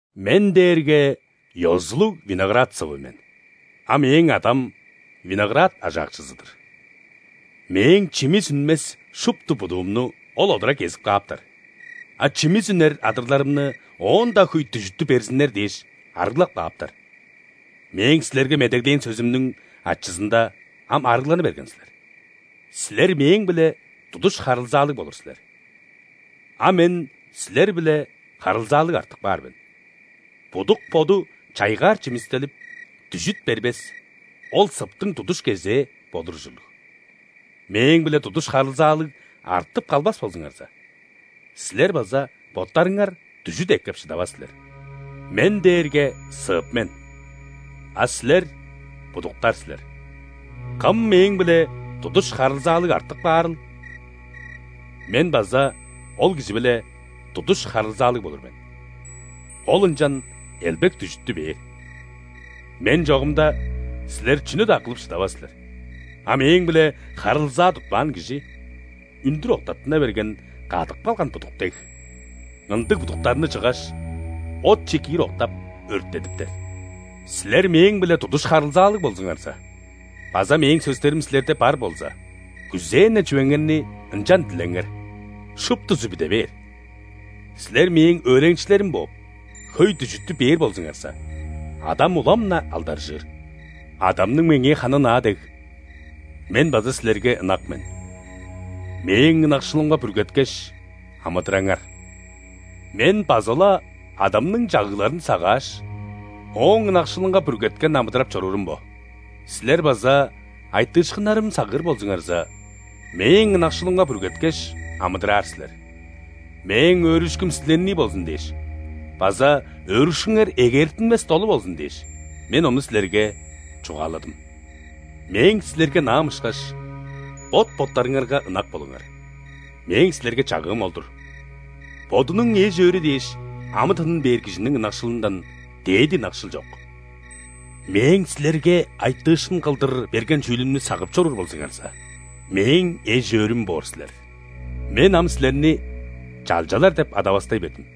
«Мен дээрге ёзулуг виноград сывы мен, а Мээң Адам – виноград ажаакчызы-дыр. Мээң чимис үнмес шупту будуумну Ол одура кезип кааптар, а чимис үнер адырларымны, оон-даа хөй дүжүттү берзиннер дээш, арыглап кааптар. Мээң силерге медеглээн сөзүмнүң ачызында ам арыгланы берген силер. Силер – Мээң-биле тудуш харылзаалыг болур силер, а Мен – силер-биле харылзаалыг артып каар мен. Будук боду чайгаар чимистелип, дүжүт бербес, ол сыптың тудуш кезээ болур ужурлуг. Мээң-биле тудуш харылзаалыг артып калбас болзуңарза, силер база боттарыңар дүжүт эккеп шыдавас силер. Мен дээрге сып мен, а силер – будуктар силер. Кым Мээң-биле тудуш харылзаалыг артып каарыл, Мен база ол кижи-биле тудуш харылзаалыг болур мен, ол ынчан элбек дүжүттү бээр. Мен чогумда, силер чүнү-даа кылып шыдавас силер. А Мээң-биле харылзаа тутпаан кижи – үндүр октаттына берген, кадып калган будук дег. Ындыг будуктарны чыггаш, отче киир октап, өрттедиптер. Силер Мээң-биле тудуш харылзаалыг болзуңарза база Мээң сөстерим силерде бар болза, күзээн-не чүвеңерни ынчан дилеңер, шуптузу бүде бээр. Силер Мээң өөреникчилерим бооп, хөй дүжүттү бээр болзуңарза, Адам улам-на алдаржыыр. Адамның Меңээ ханы ынаа дег, Мен база силерге ынак мен. Мээң ынакшылымга бүргеткеш амыдыраңар! Мен база-ла Адамның чагыгларын сагааш, Ооң ынакшылынга бүргеткен амыдырап чоруурум бо. Силер база айтыышкыннарым сагыыр болзуңарза, Мээң ынакшылымга бүргеткеш амыдыраар силер. Мээң өөрүшкүм силернии болзун дээш база өөрүшкүңер эгээртинмес долу болзун дээш, Мен ону силерге чугааладым. Мээң силерге ынаам ышкаш, бот-боттарыңарга ынак болуңар. Мээң силерге чагыым ол-дур. Бодунуң эш-өөрү дээш амы-тынын бээр кижиниң ынакшылындан дээди ынакшыл чок. Мээң силерге айтыышкын кылдыр берген чүүлүмнү сагып чоруур болзуңарза, Мээң эш-өөрүм боор силер». «Мен ам силерни чалчалар деп адавастай бердим,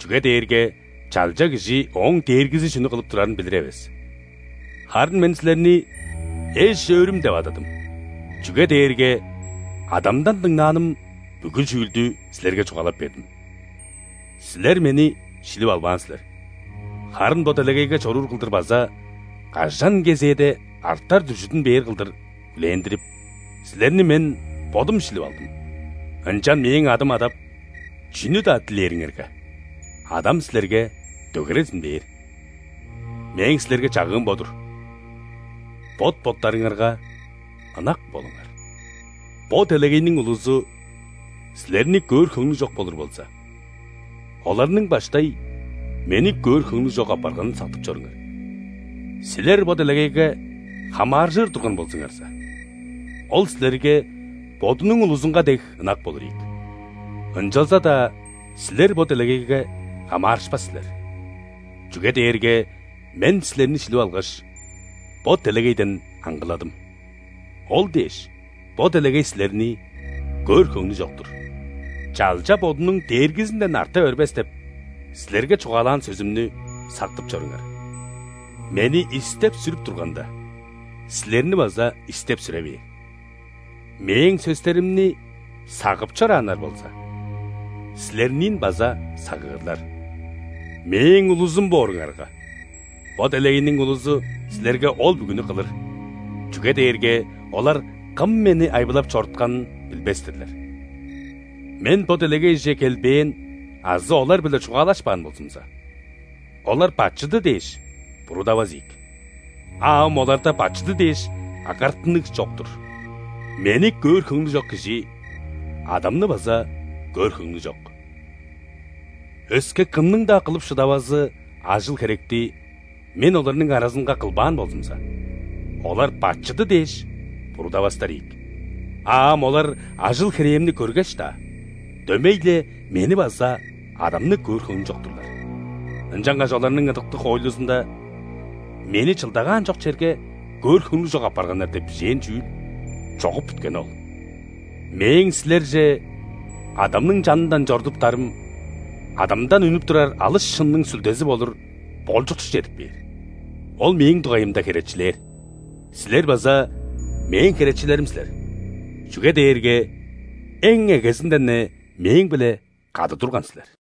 чүге дээрге чалча кижи ооң дээргизи чүнү кылып турарын билир эвес. Харын Мен силерни эш-өөрүм деп ададым, чүге дээрге Адамдан дыңнааным бүгү чүүлдү силерге чугаалап бердим. Силер Мени шилип албаан силер, харын бо делегейге чоруур кылдыр база кажан кезээде артар дүжүдүн бээр кылдыр хүлээндирип, силерни Мен Бодум шилип алдым. Ынчан Мээң адым адап, чүнү-даа дилээриңерге, Адам силерге дөгерезин бээр. Мээң силерге чагыым бо-дур: бот-боттарыңарга ынак болуңар!» «Бо делегейниң улузу силерни көөр хөңнү чок болур болза, оларның баштай Мени көөр хөңнү чок апарганын сактып чоруңар. Силер бо делегейге хамааржыр турган болзуңарза, ол силерге бодунуң улузунга дег ынак болур ийик. Ынчалза-даа силер бо делегейге хамаарышпас силер, чүге дээрге Мен силерни шилип алгаш, бо делегейден аңгыладым, ол дээш, бо делегей силерни көөр хөңнү чок-тур. „Чалча бодунуң дээргизинден арта бербес“ – деп силерге чугаалаан сөзүмнү сактып чоруңар. Мени истеп-сүрүп турганда, силерни база истеп-сүре бээр. Мээң сөстеримни сагып чорааннар болза, силерниин база сагыырлар. Мээң улузум бооруңарга, бо делегейниң улузу силерге ол бүгүнү кылыр, чүге дээрге олар Кым Мени айбылап чорутканын билбес-тирлер. Мен бо делегейже келбээн азы олар-биле чугаалашпаан болзумза, олар бачыды дээш буруудавас ийик. А ам оларда бачыды дээш агартыныг чок-тур. Мени көөр хөңнү чок кижи Адамны база көөр хөңнү чок. Өске кымның-даа кылып шыдавазы ажыл-херекти Мен оларның аразынга кылбаан болзумза, олар бачыды дээш буруудавастар ийик. А ам олар ажыл-херээмни көргеш-даа, дөмей-ле Мени база Адамны көөр хөңнү чок-турлар. Ынчангаш оларның ыдыктыг хоойлузунда: „Мени чылдагаан чок черге көөр хөңнү чок апарганнар“ деп бижээн чүүл чогуп бүткени ол». «Мээң силерже Адамның чанындан чорудуптарым, Адамдан үнүп турар алыс шынның Сүлдези болур Болчукчу чедип кээр. Ол Мээң дугайымда херечилээр. Силер база Мээң херечилерим силер, чүге дээрге эң эгезинден-не Мээң-биле кады турган силер».